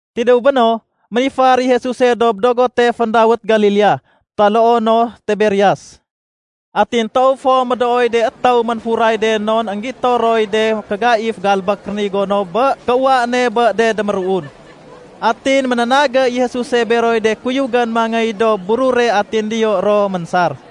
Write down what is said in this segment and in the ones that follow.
Tidéw béno, ménifar i Jesuse dob dogote féndawét Galilea taloo no Tiberias. Atin toow fo médooy de étéw ménfuray de non énggito roy de mékégaif galbék rénigo no bé kéuwa ne bé de déméruun. Atin ménénagé i Jesuse beroy de kuyugén mangéy dob burure atin diyo ro ménsar.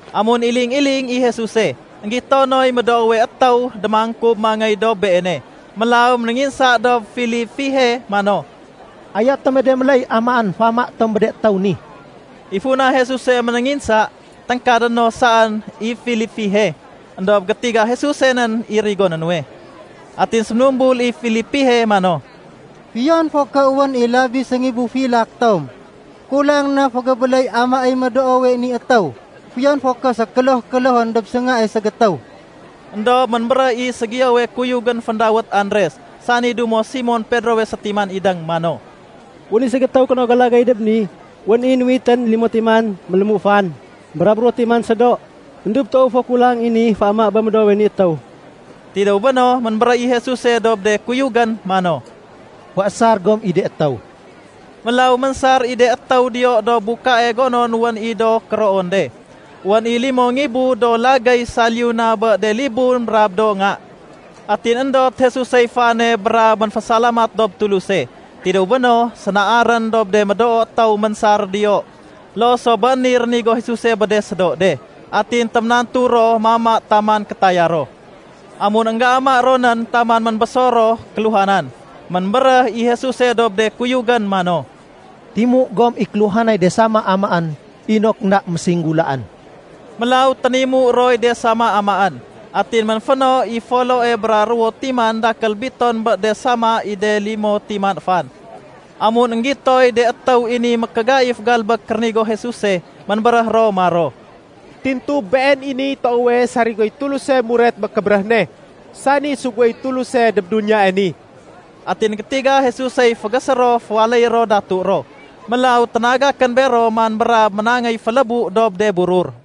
Amun iling-iling i Jesuse, énggito noy médoowe étéw démangkub mangéy dob Beene. Mélaw ménénginsa dob Filipihe mano, “Ayo tome de méléy amaén féama bé de étéw ni?” (I funa Jesuse ménénginsa, téngkadé no saén i Filipihe. Endob gétiga Jesuse nén i rigoné nuwe.) Atin séménumbul i Filipihe mano, “Fiyon fo ké wén i labi séngibu filak tom, kulang na fégébéléy amaéy médoowe ni étéw, fiyon fo ké sékéloh-kélohén dob séngae ségétéw.” Endob ménbéréh i ségiyowe kuyugén féndawét Andres (sani dumo Simon Pedrowe sétiman idéng) mano, “Wén i ségétéw kénogo lagéy dob ni, wén i nuwitén limo timan mélému fan brab ruwo timan sédo. Endob toow fo kulang i ni féama bé médoowe ni étéw.” Tidéw béno, ménbéréh i Jesuse dob de kuyugén mano, “Féésar gom i de étéw.” Mélaw ménsar i de étéw diyo dob bukae gonon wén i do kéroon de. Wén i limo ngibu do lagéy saliyu na bé de libun brab do nga. Atin éndot Jesusey fane brab ménfésalamat dob Tuluse. Tidéw béno, sénaarén dob de médoo étéw ménsar diyo. Loo so bé niy rénigo Jesuse bé de sédo de. Atin téménantu ro mama taman kétaya ro. Amun énggéama ro nén taman ménbésor ro kéluhanan, ménbéréh i Jesuse dob de kuyugén mano, “Timu gom i kéluhanay de sama amaén inok énda mésinggulaén.” Mélaw ténimu roy de sama amaén. Atin ménféno i foloe bra ruwo timan dakél biton bé de sama i de limo timan fan. Amun énggitoy de étéw i ni mékégaif galbék rénigo Jesuse, ménbéréh ro maro, “Tintu Been i niy toowe sarigoy Tuluse muret bé kébéréh ne, sani suguéy Tuluse dob duniyae ni.” Atin gétiga Jesusey fégésé ro féwaléyé ro datu ro, mélaw ténagakén bero man brab ménangéy félébu dob de burur.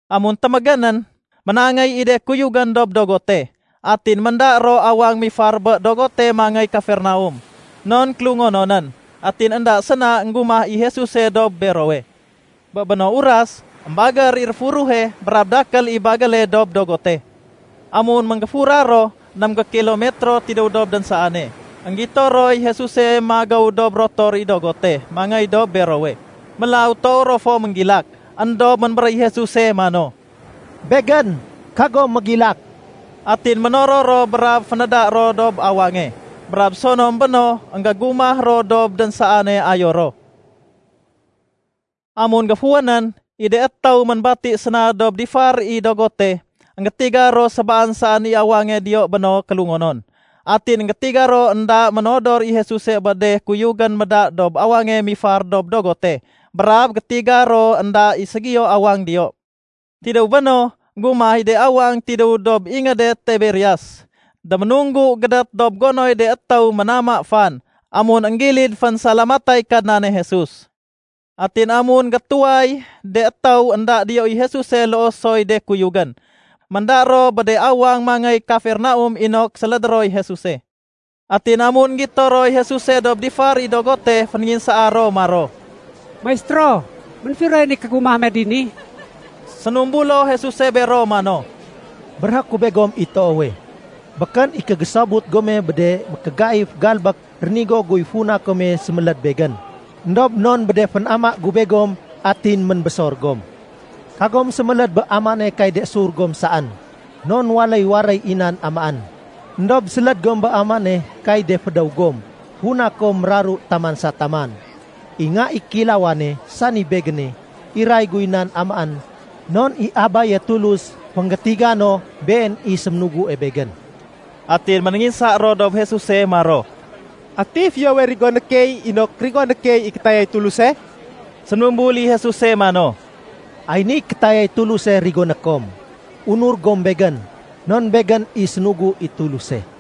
Amun témégénén, ménangéy i de kuyugén dob dogote. Atin ménda ro awang mifar bé dogote mangéy Kafernaum, non kélungononén, atin énda séna énggumah i Jesuse dob berowe. Bé béno uras, émbagér i réfuruhe brab dakél i bagéle dob dogote. Amun ménggéfura ro ném gékilomitro tidéw dob dénsaane, énggito roy Jesuse magéw dob rotor i dogote mangéy dob berowe. Mélaw toow ro fo ménggilak. Endob ménbéréh i Jesuse mano, “Begén, kagom mégilak!” Atin ménoror ro brab fénéda ro dob awange, brab sonom béno énggégumah ro dob dénsaane ayo ro. Amun géfuwénén, i de étéw ménbati séna dob difar i dogote, énggétiga ro sébaan saén i awange diyo béno kélungonon. Atin énggétiga ro énda ménodor i Jesuse bé de kuyugén méda dob awange mifar dob dogote. Brab gétiga ro énda i ségiyo awang diyo. Tidéw béno, énggumah i de awang tidéw dob ingéde Tiberias, déménunggu gédét dob gonoy de étéw ménama fan amun énggilid fénsalamatay Kadnane Jesus. Atin amun gétuway de étéw énda diyo i Jesuse loo soy de kuyugén, ménda ro bé de awang mangéy Kafernaum inok sélédé roy Jesuse. Atin amun énggito roy Jesuse dob difar i dogote, fénénginsaa ro maro, “Maistéro, ménfiroyén i kégumah me dini?” Sénumbulo Jesuse bero mano, “Béréhé ku begom i toowe, békén i kégésobut gome bé de mékégaif galbék rénigo guy funa kome séméléd Begén, éndob non bé de fénama gu begom atin ménbésor gom. Kagom séméléd bé amaéne kay de sur gom saén non waléy waréy i nan amaén. Endob séléd gom bé amaéne kay de fédéw gom funa kom méraru taman sa taman. I Nga i Kéilawane, sani Begéne, iray guy nan amaén non i Abaye Tulus fénggétiga no Been i séménugue Begén.” Atin ménénginsa ro dob Jesuse maro, “Ati fiyowe rigoné key inok rigoné key i kétayay Tuluse?” Séménumbul i Jesuse mano, “Ay niy kétayay Tuluse rigoné kom: Unur gom Begén non Begén i sénugu i Tuluse.”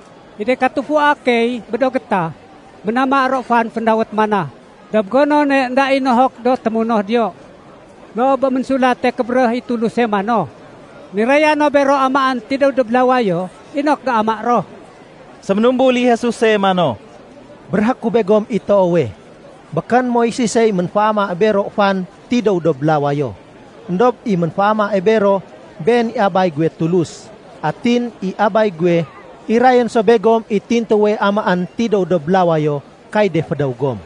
I de katufua key bé do gétah, ménama ro fan féndawét ‘mana’ dob gonone énda i nohok do témunoh diyo, loo bé Ménsulate Kébéréh i Tuluse mano, ‘Niraya no bero amaén tidéw dob lawayo inok géama ro.’” Séménumbul i Jesuse mano, “Béréhé ku begom i toowe, békén Moises i ménféamae bero fan tidéw dob lawayo, éndob i ménféama bero been i Abay guwe Tulus. Atin i Abay guwe, irayén so begom i tintuwe amaén tidéw dob lawayo kay de fédéw gom.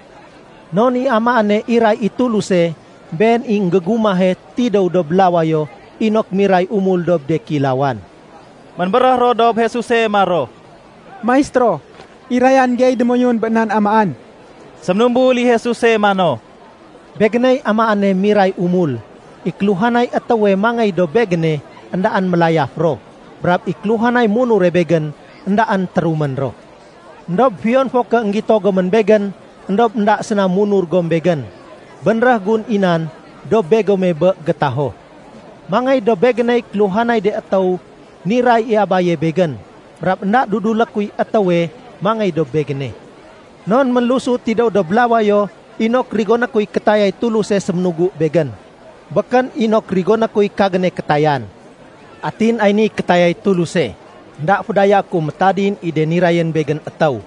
Non i amaéne iray i Tuluse, been i énggégumahe tidéw dob lawayo inok miray umul dob de kéilawan.” Ménbéréh ro dob Jesuse maro, “Maistéro, irayan gey démoyun bé nan amaén.” Séménumbul i Jesuse mano, “Begéney amaéne miray umul. I kéluhanay étéwe mangéy dob Begéne éndaén mélayaf ro, brab i kéluhanay munure Begén éndaén térumén ro. Endob fiyon fo ké énggito gomén Begén, éndob énda séna munur gom Begén. Bénréh gun i nan dob begome bé gétaho. Mangéy dob Begéney kéluhanay de étéw niray i Abaye Begén. Brab énda dudulé kuy étéwe mangéy dob Begéne. Non ménlusu tidéw dob lawayo inok rigoné kuy kétayay Tuluse séménugu Begén, békén inok rigoné kuy kagéne kétayan. Atin ay niy kétayay Tuluse: énda fédayaé ku métadin i de nirayén Begén étéw,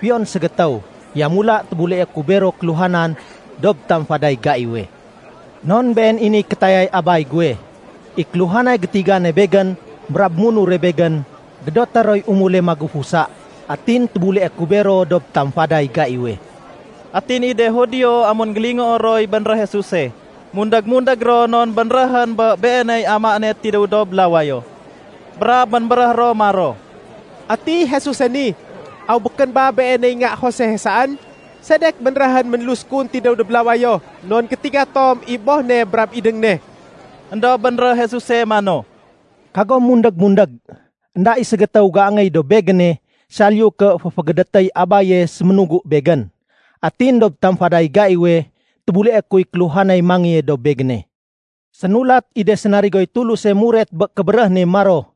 fiyon ségétéw. Yamula tébuleé ku bero kéluhanan dob tamfaday gaiwe. Non been i niy kétayay Abay guwe: i kéluhanay gétigane Begén brab munure Begén, gédoté roy umule magufusa. Atin tébuleé ku bero dob tamfaday gaiwe.” Atin i de Judio amun énggélingoo roy bénréh Jesuse, mundég-mundég ro non bénréhén bé Beeney amaéne tidéw dob lawayo. Brab ménbéréh ro maro, “Ati Jesuse ni, aw békén ba Beeney nga Josehe saén? Sedek bénréhén ménlus kun tidéw dob lawayo, non gétiga tom i boh ne brab idéng ne?” Endob bénréh Jesuse mano, “Kagom mundég-mundég. Enda i ségétéw géangéy dob Begéne, saliyu ké féfégédétéy Abaye séménugu Begén. Atin dob tamfaday gaiwe, tébuleé kuy kéluhanay mangéye dob Begéne. Sénulat i de sénarigoy Tuluse muret bé kébéréh ne maro,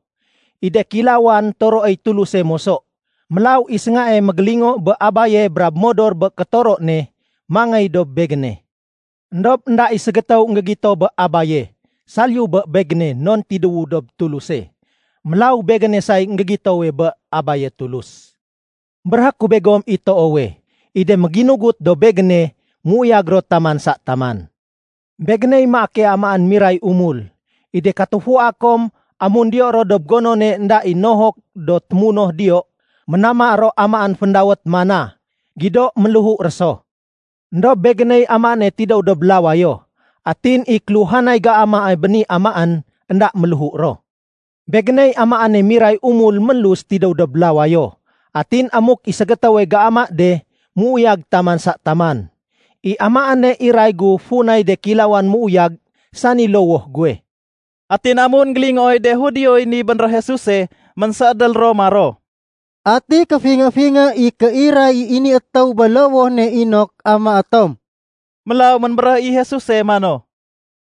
‘I de kéilawan toroéy Tuluse moso.’ Mélaw i séngae mégélingo bé Abaye brab modor bé kétoro ne, mangéy dob Begéne. Endob énda i ségétéw énggégito bé Abaye, saliyu bé Begéne non tidéwu dob Tuluse. Mélaw Begéne say énggégitowe bé Abaye Tulus. Béréhé ku begom i toowe, i de méginugut dob Begéne méuyag ro taman sa taman. Begéney maake amaén miray umul. I de katufua kom amun diyo ro dob gonone énda i nohok do témunoh diyo, ménama ro amaén féndawét ‘mana’, gido ménléhu ro so. Endob Begéney amaéne tidéw dob lawayo. Atin i kéluhanay géamae bé ni amaén, énda méléhu ro. Begéney amaéne miray umul ménlus tidéw dob lawayo. Atin amuk i ségétéwe géama de, méuyag taman sa taman. I amaéne iray gu funay de kéilawan méuyag, sani lowoh guwe.” Atin amun énggélingooy de Judioy ni bénréh Jesuse, ménséédél ro maro, “Ati kéfingé-fingé i kéiray i ni étéw bé lowoh ne inok amaé tom?” Mélaw ménbéréh i Jesuse mano,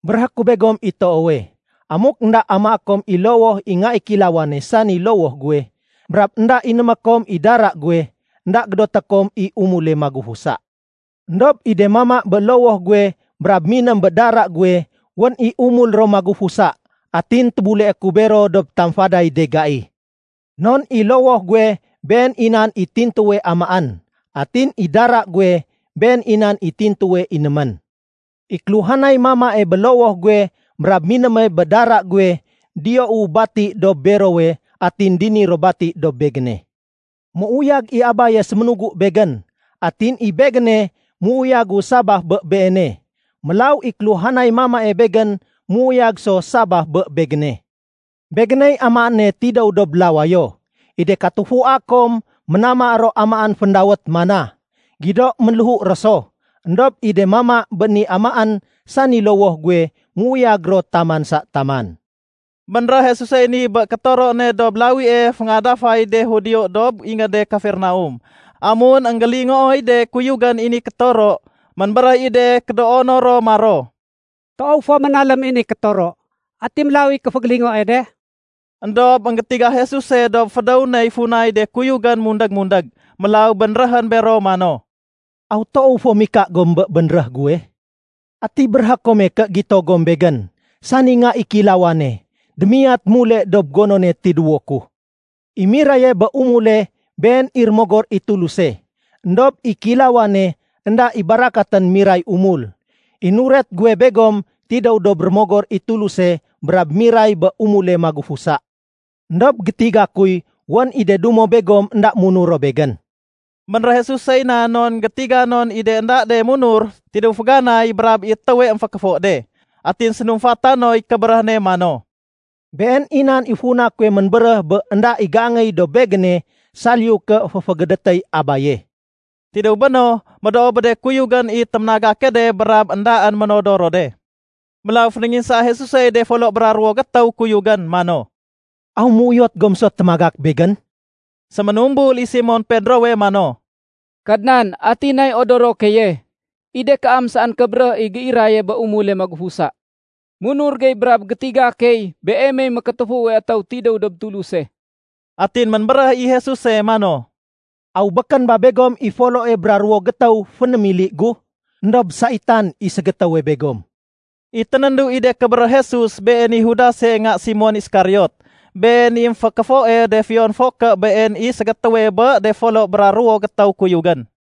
“Béréhé ku begom i toowe, amuk énda amaé kom i lowoh i Nga i Kéilawane sani lowoh guwe, brab énda inémé kom i dara guwe, énda gédoté kom i umule magufusa. Endob i de mama bé lowoh guwe brab miném bé dara guwe, wén i umul ro magufusa, atin tébuleé ku bero dob tamfaday de gai. Non i lowoh guwe been i nan i tintuwe amaén, atin i dara guwe been i nan i tintuwe inémén. I kéluhanay mamae bé lowoh guwe brab minéme bé dara guwe diyou bati dob berowe atin dini ro bati dob Begéne. Méuyag i Abaye séménugu Begén, atin i Begéne méuyagu sabaf bé Beene. Mélaw i kéluhanay mamae Begén méuyag so sabaf bé Begéne. Begéney amaéne tidéw dob lawayo. I de katufua kom ménama ro amaén féndawét ‘mana’, gido ménléhu ro so. Endob i de mama bé ni amaén sani lowoh guwe méuyag ro taman sa taman.” Bénréh Jesusey ni bé kétoro ne dob lawie féngadafay de Judio dob ingéde Kafernaum. Amun énggélingooy de kuyugén i ni kétoro, ménbéréh i de kédoono ro maro, “Toow fo ménalém i ni kétoro, ati mélaw i géfégélingoe de?” Endob énggétiga Jesuse dob fédéw ney funay de kuyugén mundég-mundég. Mélaw bénréhén bero mano, “Aw toow fo mika gom bé bénréh guwe? Ati béréhé kome ké gito gom Begén, sani Nga i Kéilawane, démiyat mule dob gonone tidéwo ku? I miraye bé umule been i Rémogor i Tuluse. Endob i kéilawane, énda i barakatén miray umul. I nuret guwe begom tidéw dob Rémogor i Tuluse brab miray bé umule magufusa. Endob gétiga kuy wén i de dumo begom énda munur ro Begén.” (Bénréh Jesusey nan non gétiga non i de énda de munur tidéw féganay brab i étéwe émfékéfo de.) Atin sénumfata noy kébéréh ne mano, “Been i nan i funa kuwe ménbéréh bé énda i géangéy dob Begéne saliyu ké féfégédétéy Abaye.” Tidéw béno, médoo bé de kuyugén i téménagake de brab éndaén ménodor ro de. Mélaw fénénginsaa Jesusey de folo bra ruwo gétéw kuyugén mano, “Aw méuyot gom so témagak Begén?” Séménumbul i Simon Pedrowe mano, “Kadnan ati nay odoro keye? I de kaam saén kébéréh i géiraye bé umule magufusa. Munur gey brab gétiga key Beemey Mékétéfuwe Etéw tidéw dob Tuluse.” Atin ménbéréh i Jesuse mano, “Aw békén ba begom i foloe bra ruwo gétéw fénémili gu? Endob saitan i ségétéwe begom!” I ténéndu i de kébéréh Jesus, been i Judase nga Simon Iskariot. Been i émfékéfoe de fiyon fo ké been i ségétéwe bé de folo bra ruwo gétéw kuyugén.